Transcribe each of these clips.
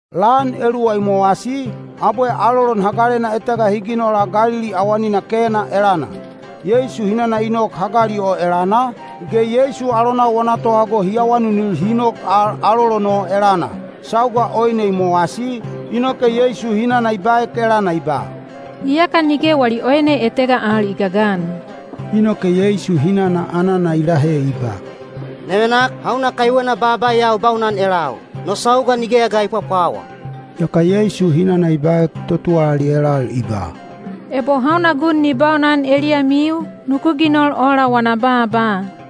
Lan eluwa i mowasi, abwe alolon hagalena etega hi ginola Galili awanina Kena elana. Yeisu hinana i nok hagali o elana, ge Yeisu alonau wana tohago hi awanunil hi nok al alolon o elana. Sauga oine i mowasi, inoke Yeisu hinana i baek elana i ba, “Iyaka nige wali oine etega al i gagan.” Inoke Yeisu hinana anana i lahe i ba, “Nevenak, hauna kaiwena baaba ya u baunan elau? No sauga nigeya ga i pwapwawa.” Yaka Yeisu hinana i baek totuwalali elal i ba, “Ebo hauna gun ni baunan eliyamiu, nuku ginol ola wana baaba.”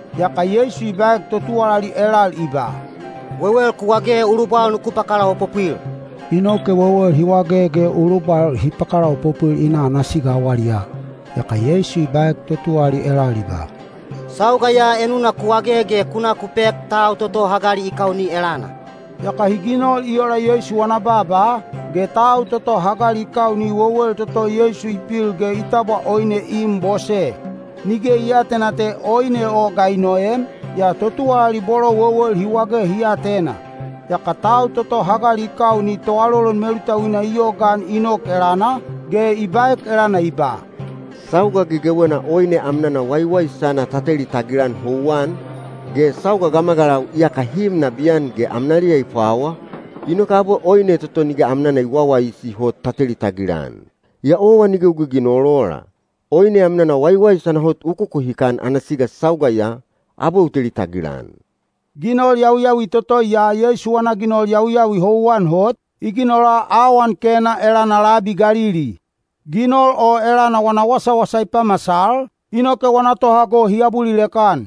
Yaka Yeisu i baek totuwalali elal i ba, “Wewel ku wage ulubwal nuku pakalaopopwil.” Inoke wewel hi wage ge ulubwal hi pakalaopopwil i na ana siga awaliyaa. Yaka Yeisu i baek totuwalali elal i ba, “Sauga ya enuna ku wage ge ku na ku pek tau toto hagali i kauni elana.” Yaka hi ginol i ola Yeisu wana baaba, ge tau toto hagali i kauni wewel toto Yeisu i pil ge i tabwa oine i im bose. Nige i aatena te oine o ga i noem, yaa totuwalali bolo wewel hi wage hi atena. Yaka tau toto hagali i kauni toalolon melutauina i yogaan i nok elana, ge i baek elana i ba, “Sauga gegewena oine amnana waiwaisana ta teli tagilan houwan, ge sauga gamagalau iyaka hi im nabiyan ge amnaliya i pwawa, inoke abwe oine toto nige amnana i wawaisi hot ta teli tagilan. Yaa owa nige u giginol ola. Oine amnana waiwaisana hot u kukuhikan ana siga sauga ya, abwe u teli tagilan.” Ginol yawiyawi toto ya Yeisu wana ginol yawiyawi houwan hot, i ginola awan Kena elana labi Galili. Ginol o elana wana wasawasa i pamasal, inoke wana tohago hi abulilek-an.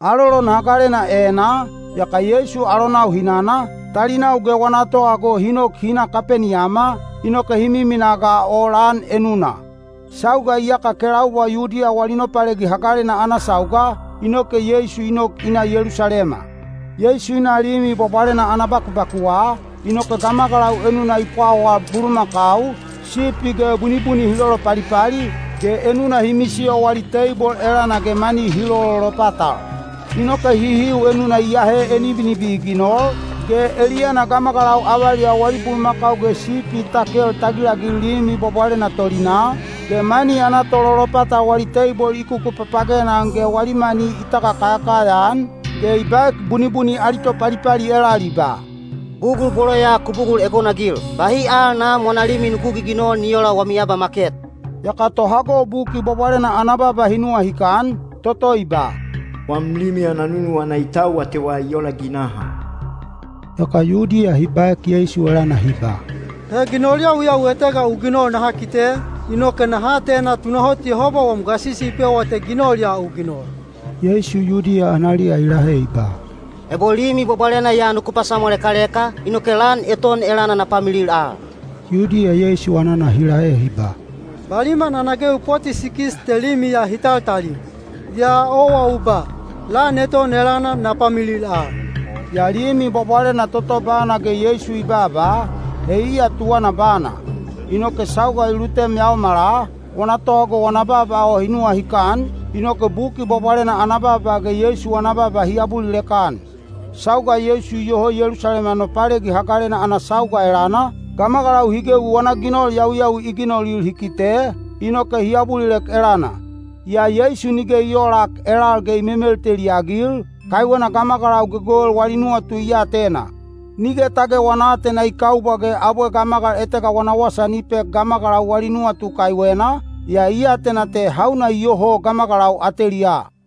Alolon hagalena enaa, yaka Yeisu alonau hinana, talinau ge wana tohago hi nok hi na Kapeniyama, inoke hi miminaa ga o lan enuna. Sauga iyaka kelaubwa Yudiya wali Nopalegi Hagalena ana sauga, inoke Yeisu i nok i na Yelusalema. Yeisu i na Limi Bwabwalena ana bakubakuwa, inoke gamagalau enuna i pwawal bulumakau, sipi ge bunibuni hi lolopalipali, ge enuna hi misiyo wali teibol elana ge mani hi lololopatal. Inoke hihiu enuna i ahe enibinibi i ginol, ge eliyana gamagalau avaliyau wali bulumakau ge sipi i takel tagilagil Limi Bwabwalena tolinaa, ge mani ana tololopatal wali teibol i kukupapagena-an ge wali mani i tagakayakaya-an, ge i baek bunibuni ali topalipali elal i ba, “Bugul bolo ya ku bugul egonagil! Bahi al Nam wana limi nuku giginol ni oola wami abamaket!” Yaka tohago Buki Bwabwalena ana baaba hi nuwahikan, toto i ba, “Wam limi ana nunuwana i tau atewa i ola ginaha.” Yaka Yudiya hi baek Yeisu elana hi ba, “He ginol yawiyawi etega u ginol naha kite, inoke naha atena tunahot Yehoba wam gasisi i pewa te ginol ya u ginol.” Yeisu Yudiya analiya i lahe i ba, “Ebo Limi Bwabwalena ya nuku pasamwalekaleka, inoke lan eton elana na pamilil al.” Yudiya Yeisu anana hi lahe hi ba, “Baliman ana gewi poti sikis te limi ya hi taltali, yaa owa u ba, ‘Lan eton elana na pamilil al.’” Yaa Limi Bwabwalena toto bana ge Yeisu i babaa, he iya tuwana bana. Inoke sauga i lutem yaomala, wana tohago wana baaba o hi nuwahikan, inoke Buki Bwabwalena ana baaba ge Yeisu wana baaba hi abulilek-an. Sauga Yeisu iyoho Yelusalema Nopalegi Hagalena ana sauga elana, gamagalau hi gewi wana ginol yawiyawi i ginolil hi kite, inoke hi abulilek elana. Yaa Yeisu nige i oolak elal ge i memelteli-agil, kaiwena gamagalau gegewel wali nuwatu i atena. Nige tage wana aatena i kaubwa ge abwe gamagal etega wana wasa ni pek gamagalau wali nuwatu kaiwena, yaa i atena te hauna iyoho gamagalau ateliyaa.